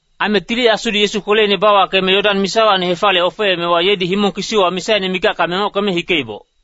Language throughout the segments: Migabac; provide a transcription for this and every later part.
Aime Tili Asudi Yesu kweleine bawakeme Yodan misawacni hefaliye ofeemewa, yedi himong kisiwa misaine mikacka mengockeme hikeiboc.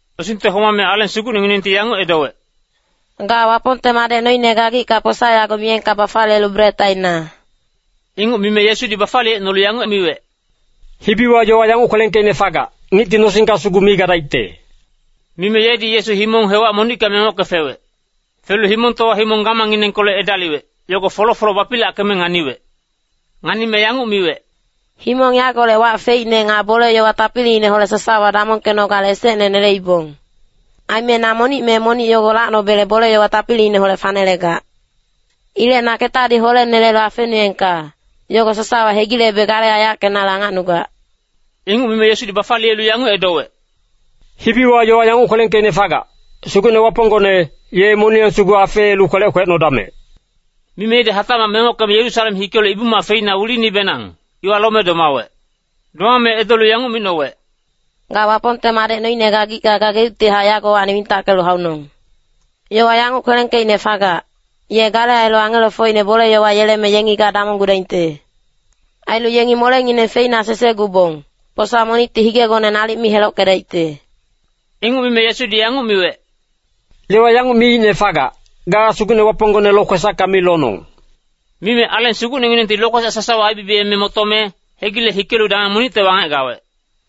Nosingte homame Aleng Sugucnenginengti yanguc edowec, “Ga Wapongte Madec noine gagicka posa yago miyengka bafaliyelu bret aina!” Inguc mime Yesudi bafaliyecnolu yanguc miwec, “Hibiwa yowa yanguc kwelengkeicne fagac, ‘Ngicti nosingka sugu mi gadaicte.’” Mime yedi Yesu himong hewac monicka mengocke fewec. Felu himongtowa himong gamangnginengkolec edaliwec, yogo folo-folo bapilackeme nganiwec. Nganime yanguc miwec, “Himong yagolec wac feicne nga bole-yowa tapiliineholec sasawa damongkenogale esecne neleibong. Aime na monic me monic yogo lacnobele bole-yowa tapiliineholec fanelegac. Ilec na ketadi holenelelu afenuengka, yogo sasawa hegilebe gale aiyackenale angacnugac.” Inguc mime Yesudi bafaliyelu yanguc edowec, “Hibiwa yowa yanguc kwelengkeicne fagac, ‘Sugucne Waponggone, ye moniyang sugu afeelu kwelec kwecnodamec!’” Mime yedi hatacmac mengockeme Yerusalem hikelu Ibu-mac feina wilinibenang, iwa lome domawec. Domame edolu yanguc micnowec, “Ga Wapongte Madec noine gagicka gageuctihac yagowacni wintackelu haunong! Yowa yanguc kwelengkeicne fagac, ‘Ye gale ailu angelofocine bole-yowa yeleme yengi ga damonggudaingte. Ailu yengi molengineng feina sesegubong, posa monicti higegone nalic mi helockedaicte.’” Inguc mime Yesudi yanguc miwec, “Yowa yanguc miicne fagac, ‘Ga Sugucne Waponggone lokwesacka mi lonong!’” Mime Aleng Sugucnenginengti lokwesac sasawa aibibiyeme motome, hegile hikelu dameng monicte wangec gawec.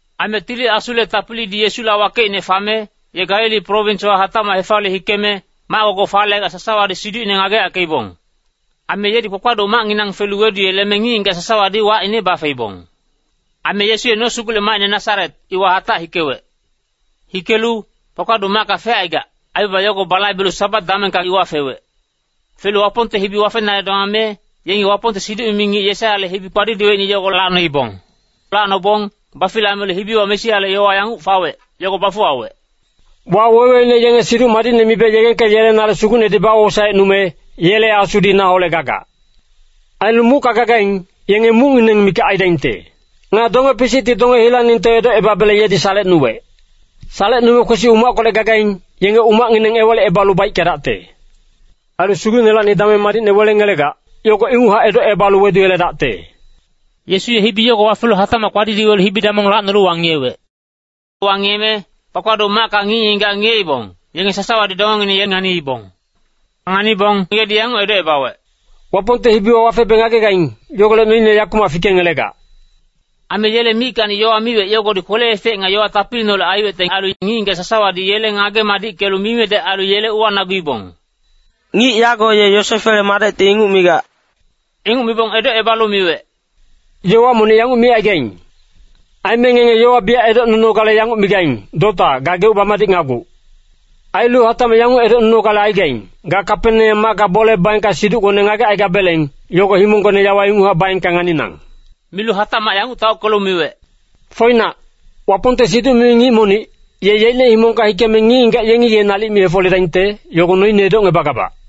Aime Tili Asule tapilidi Yesula wakeicne fame, ye Galili prowinswa hatacmac hefaliye hikeme, mac-gogoc falegac sasawadi siducine ngageyackeibong. Aime yedi kpakpaduc macnginang felu weduyeleme ngic-ngigac sasawadi wacine bafeibong. Aime Yesu ye nosugulec macine Nasaret, iwa hatac hikewec. Hikelu, kpakpaduc macka fecaigac, aibaba yogo balaibelu Sabat damengka iwa fewec. Felu Wapongte hibi wafenale domame, yengi Wapongte siduc-mimi ngic Yesaiyale hibi kpadidiweicne yogo lacnoibong. Lacnobong bafilamelu hibiwa Mesiale yowa yanguc fawec, yogo bafuwawec. “Waweweine yenge Siduc Madicne mibe yegengkeyelenale Sugucnedi bawosaecnume, yele Asudi naholec gagac. Ailu mucka gagaing, yenge mucngineng mikac aidaingte. Nga donge-pisicti donge hilaningte edocebabele yedi salecnuwec. Salecnume kwesi umackolec gagaing, yenge umacngineng ewalicebalu baickedacte. Ailu Sugucnelacni dameng madicne welengelegac, yogo inguchac edocebalu weduyeledacte.” Yesu ye hibi yogo wafelu hatacmac kpadidiwelu hibi-damong lacnolu wangiyewec. Wangiyeme kpakpaduc macka ngic-ngigac ngiyeibong, yenge sasawadi dongengineng ye nganiibong. Nganibong yedi yanguc edocebawec, “Wapongte hibiwa wafebe ngagegaing, yogolec noine yakumac fikengelegac.” Aime yele mickacni yowa miwec, yogodi kwele-efec nga yowa tapiliineholec aiwecte ailu, ngic-ngigac sasawadi yele ngage-madickelu mimedec ailu yele uwanaguibong, “Ngic yago ye Yosefele madecti inguc migac!” Inguc mibong edocebalu miwec, “Yowa monic yanguc micaigaing. Aime ngenge yogo biyac edocnunogale yanguc migaing, ‘Dota, gageuc bamadicnaguc!’ Ailu hatacmac yanguc edocnunogale aigaing, ‘Ga Kapeneam macka bole baengka siducgone ngagecaigabeleng, yogo himonggona yawa inguchac baengka nganinang!’” Milu hatacmac yanguc taockelu miwec, “Foinac, Wapongte siduc-mimi ngic monic, ye yeicne himongka hikeme ngic-ngigac yengi ye nalic mi hefoledaingte, yogo noine edocngebagabac.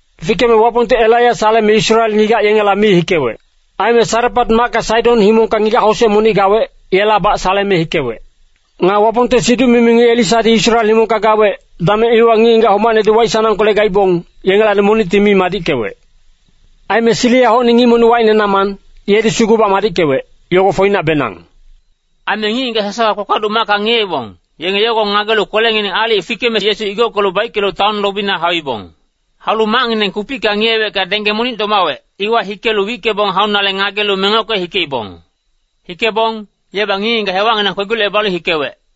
Fikeme Wapongti Elaiya saleme Israel ngigac yengela mi hikewec. Aime Sarepat macka Saidon himongka ngigac-hosec monic gawec, yelabac saleme hikewec. Nga Wapongte siduc-mimi ngic Elisadi Israel himongka gawec, dameng iwa ngic-ngigac homacnedi waic-sanangkolec gaibong, yengelacni monicti mi madickewec. Aime Siriahocni ngic monic wacine Naman, yedi sugubac madickewec, yogo foinacbenang.” Aime ngic-ngigac sasawa kpakpaduc macka ngiyeibong, yenge yogo ngagelu kwelengineng aalic fikeme Yesu igockelu baickelu taon lobina hauibong. Haulu macngineng kupicka ngiyewecka dengge monic domawec, iwa hikelu wickebong haunale ngagelu mengocke hikeibong. Hikebong, yebac ngic-ngigac hewacnginang kwegi-locebalu hikewec.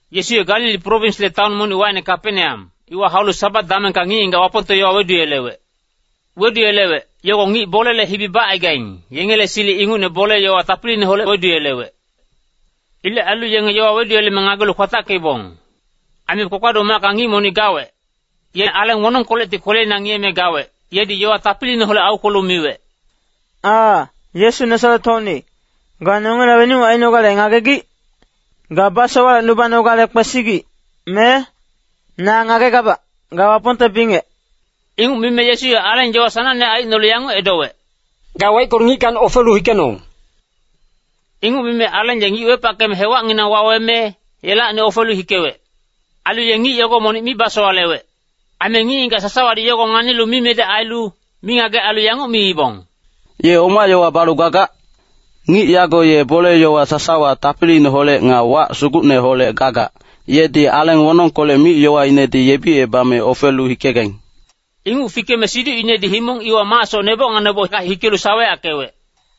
Yesu ye Galili prowinsle taon monic, wacine Kapeneam, iwa haulu Sabat damengka ngic-ngigac Wapongte yowa weduyelewec. Weduyelewec, yogo ngic bolele hibi bacaigaing, yengele silic ingucne bole-yowa tapiliineholec weduyelewec. Ilec ailu yenge yowa weduyeleme ngagelu kwatackeibong. Aime kpakpaduc macka ngic monic gawec. Ye aleng wonongkolecti kweleina ngiyeme gawec, yedi yowa tapiliineholec aukwelu miwec, “Aa, Yesu Nasaret-hocni, ga nongela wenuc ainogale ngagegic? Ga basowalecnubanogale kwesigic, me? Na ngagegabac, ga Wapongte bingec.” Inguc mime Yesu ye aleng yowa sanangne aicnolu yanguc edowec, “Ga waickelu ngickacni ofelu hikenong!” Inguc mime aleng ye ngic wepackeme hewacnginang waweme, yelacni ofelu hikewec. Ailu ye ngic yogo monic mi basowalewec. Aime ngic-ngigac sasawadi yogo nganilu mimedec ailu, mingagec ailu yanguc miibong, “Ye oma yowa balu gagac? Ngic yago ye bole-yowa sasawa tapiliineholec nga wac sugucneholec gagac, yedi aleng wonongkolec mic-yowainedi yebicebame ofelu hikegaing.” Inguc fikeme siducinedi himong iwa macsoc neboc nga nebocka hikelu saweyackewec.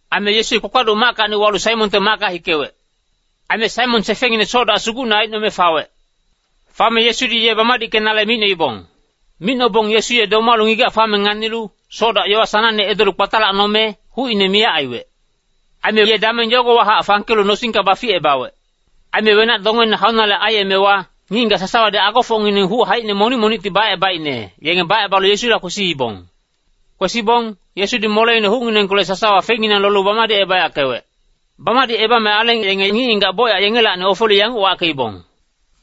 Aime Yesu ye kpakpaduc mackacni walu Saimonte macka hikewec. Aime Saimon sefengngine ye soc-dac sugucne aicnome fawec. Fame Yesudi ye bamadickenale micnoibong. Micnobong Yesu ye domalu ngigac fame nganilu, soc-dac yowa sanangne edolu kpatalacnome, hucine miyac aiwec. Aime ye dameng yogowahac fangkelu nosingka baficebawec. Aime wenac-dongeine haunale aiyemewa, ngic-ngigac sasawadi agofocngineng huc haicine monic-monicti bacebaicne, yenge bacebalu Yesula kwesiibong. Kwesibong, Yesudi moleine hucnginengkolec sasawa fenginang lolu bamadicebayackewec. Bamadicebame aleng yenge ngic-ngigac bocyac yengelacni ofelu yanguc wackeibong,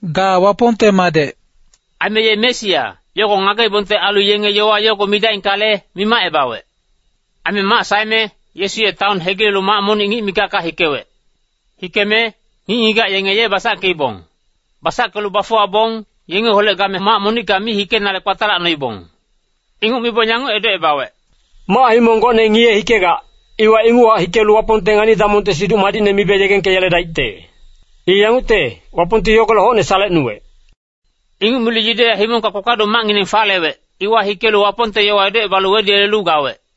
“Ga Wapongte Madec.” Aime ye Mesia, yogo ngageibongte ailu yenge yowa yogo midaingkale, mimacebawec. Aime mac saeme, Yesu ye taon hegilelu mac monic ngic mikacka hikewec. Hikeme, ngic-ngigac yenge ye basackeibong. Basackelu bafuwabong, yengeholec game mac monicka mi hikenale kpatalacnoibong. Inguc mibong yanguc edocebawec, “Mac-himong gocne ngiye-hikegac, iwa inguchac hikelu Wapongte ngani-damongte Siduc Madicne mibe yegengkeyeledaicte. I yangucte, Wapongti yogolec hocne salecnuwec.” Inguc milu Yudeya himongka kpakpaduc macngineng falewec, iwa hikelu Wapongte yowa edocebalu weduyelelu gawec.